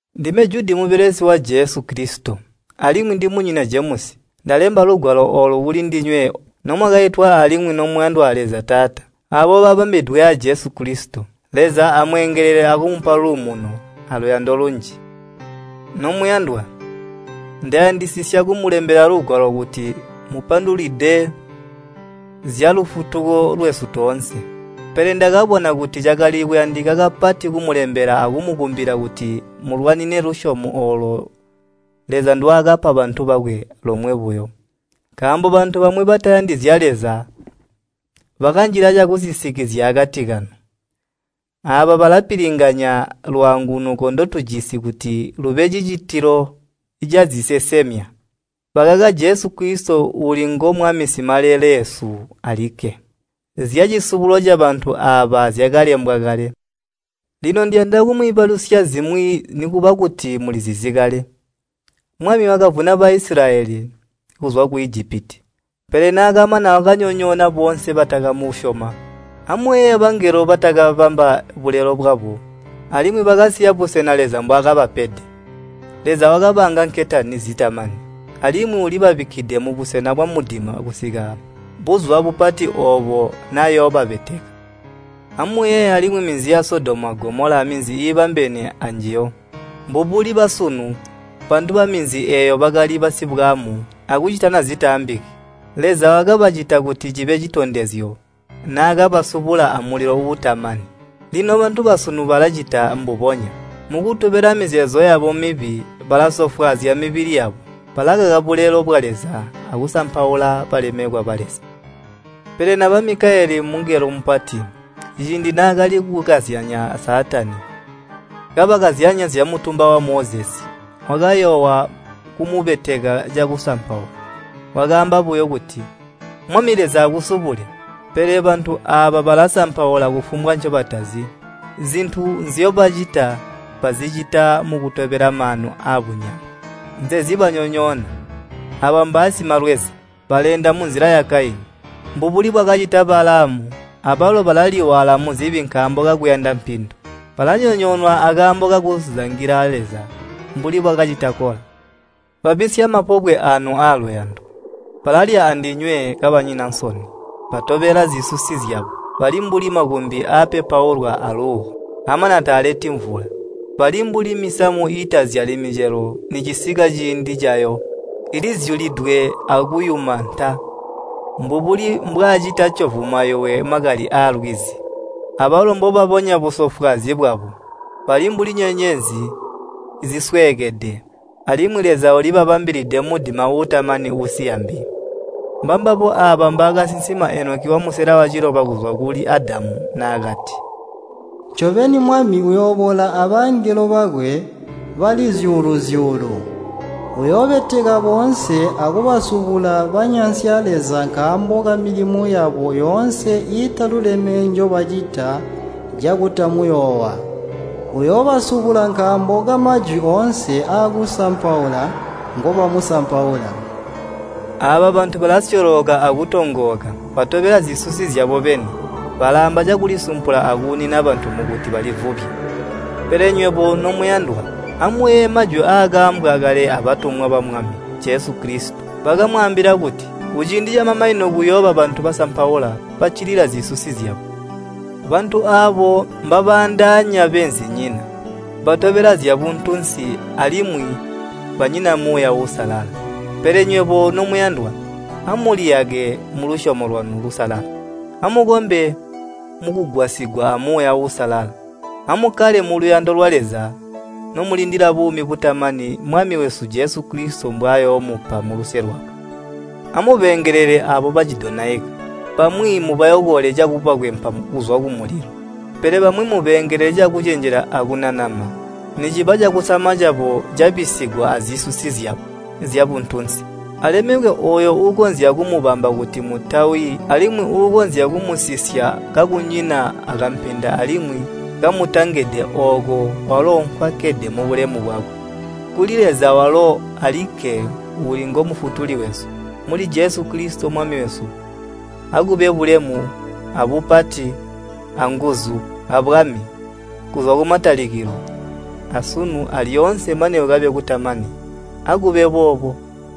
Ndime Judi mubelesi wa Jesu Kilisito, alimwi ndimunyina Jemusi. Ndalemba lugwalo oolu kuli ndinywe nomwakaitwa alimwi nomuyandwa a Leza Taata, aabo babambidwe a Jesu Kilisito. Leza amweengelele akumupa luumuno, aluyando lunji. Nomuyandwa, ndayandisisya kumulembela lugwalo kuti mmupandulwide zyalufutuko lwesu toonse. Pele ndakabona kuti cakali kuyandika kapati kumulembela akumukumbila kuti mulwanine lusyomo oolo Leza ndwaakapa bantu bakwe lomwe buyo. Nkaambo bantu bamwi batayandi zya Leza bakanjila cakusisikizya akati kanu. Aaba balapilinganya lwaangunuko ndotujisi kuti lube cicitilo cazisesemya. Bakaka Jesu Kilisito uuli ngo Mwami Simaleleesu alikke. Zyacisubulo cabantu aaba zyakalembwa kale. Lino ndiyanda kumwiibalusya zimwi nikuba kuti mulizizi kale. Mwami wakavuna Baisilayeli kuzwa ku Ijipiti, pele naakamana wakanyonyoona boonse batakamusyoma. Amuyeeye bangelo batakabamba bulelo bwabo, alimwi bakasiya busena Leza mbwaakabapede. Leza wakabaanga nketani zitamani, alimwi ulibabikkide mubusena bwamudima kusika buzuba bupati oobo nayoobabeteka. Amuyeeye alimwi minzi ya Sodomu a Gomola aminzi iibambene aanjiyo. Mbubuli basunu, bantu baminzi eeyo bakali basibwaamu akucitana zitaambiki. Leza wakabacita kuti cibe citondezyo naakabasubula amulilo uutamani. Lino bantu basunu balacita mbubonya. Mukutobela mizeezo yabo mibi, balasofwaazya mibili yabo, balakaka bulelo bwa Leza akusampaula balemekwa ba Leza. Pele naba Mikayele mungelo mupati ciindi naakali kukazyanya a Saatani, kabakazyanya zyamutumba wa Mozesi, wakayoowa kumubeteka cakusampaula. Wakaamba buyo kuti, “Mwami Leza akusubule!” Pele bantu aaba balasampaula kufumbwa ncobatazi, zintu nzyobacita bazicita mukutobela maanu aabunyama. Nzezibanyonyoona. Aaba mbaasimalweza! Baleenda munzila ya Kaini. Mbubuli bwakacita Balaamu abalo balaliwaala muzibi nkaambo kakuyanda mpindu. Balanyonyoonwa akaambo kakuzangila Leza mbuli bwakacita Kola. Babisya mapobwe aanu aaluyando. Balalya andinywe kabanyina nsoni, batobela zisusi zyabo. Bali mbuli makumbi apepaulwa aluuwo, amana taaleti mvula. Bali mbuli misamu iitazyali micelo nicisika ciindi cayo, ilizyulidwe akuyuma nta. Mbubuli mbwaacita ccovu mayuwe makali aalwizi, abalo mbobabonya busofwaazyi bwabo. Bali mbuli nyenyezi zisweekede, alimwi Leza ulibabambilide mudima uutamani uusiya mbi. Mbambabo aaba mbaakasinsima Enoki wamusela waciloba kuzwa kuli Adamu naakati, “Ncobeni, Mwami uyooboola abangelo bakwe bali zyuulu-zyuulu. Uyoobeteka boonse akubasubula banyansya Leza nkaambo kamilimo yabo yoonse iitaluleme njobacita cakutamuyoowa. Uyoobasubula nkaambo kamajwi oonse aakusampaula ngobamusampaula.” Aaba bantu balasyolooka akutoongoka, batobela zisusi zyabo beni, balaamba cakulisampula akuunina bantu mukuti balivubye. Pele nywebo, nomuyandwa, amuyeeye majwi aakaambwa kale abatumwa ba Mwami Jesu Kilisito. Bakamwaambila kuti, “Kuciindi camamanino kuyooba bantu basampaula, baccilila zisusi zyabo.” Bantu aabo mbabaandaanya beenzinyina. Batobela zyabuntunsi alimwi banyina Muuya Uusalala. Pele nywebo, nomuyandwa, amuliyake mulusyomo lwanu lusalala. Amukombe mukugwasigwa a Muuya Uusalala. Amukkale muluyando lwa Leza nomulindila buumi butamani Mwami wesu Jesu Kilisito mbwayoomupa muluse lwakwe. Amubeengelele aabo bacidonaika. Bamwi mubayokole cakubakwempa kuzwa kumulilo. Pele bamwi mubeengelele cakucenjela akunanama niciba cakusama cabo cabisigwa azisusi zyabo zyabuntunsi. Alemekwe ooyo uukonzya kumubamba kuti mutawi alimwi uukonzya kumusisya kakunyina akampenda alimwi kamutangede ooko walo nkwakkede mubulemu bwakwe. Kuli Leza walo alikke uuli ngo Mufutuli wesu, muli Jesu Kilisito Mwami wesu, akube bulemu, abupati, anguzu, abwami, kuzwa kumatalikilo, asunu alyoonse mane kukabe kutamani. Akube boobo.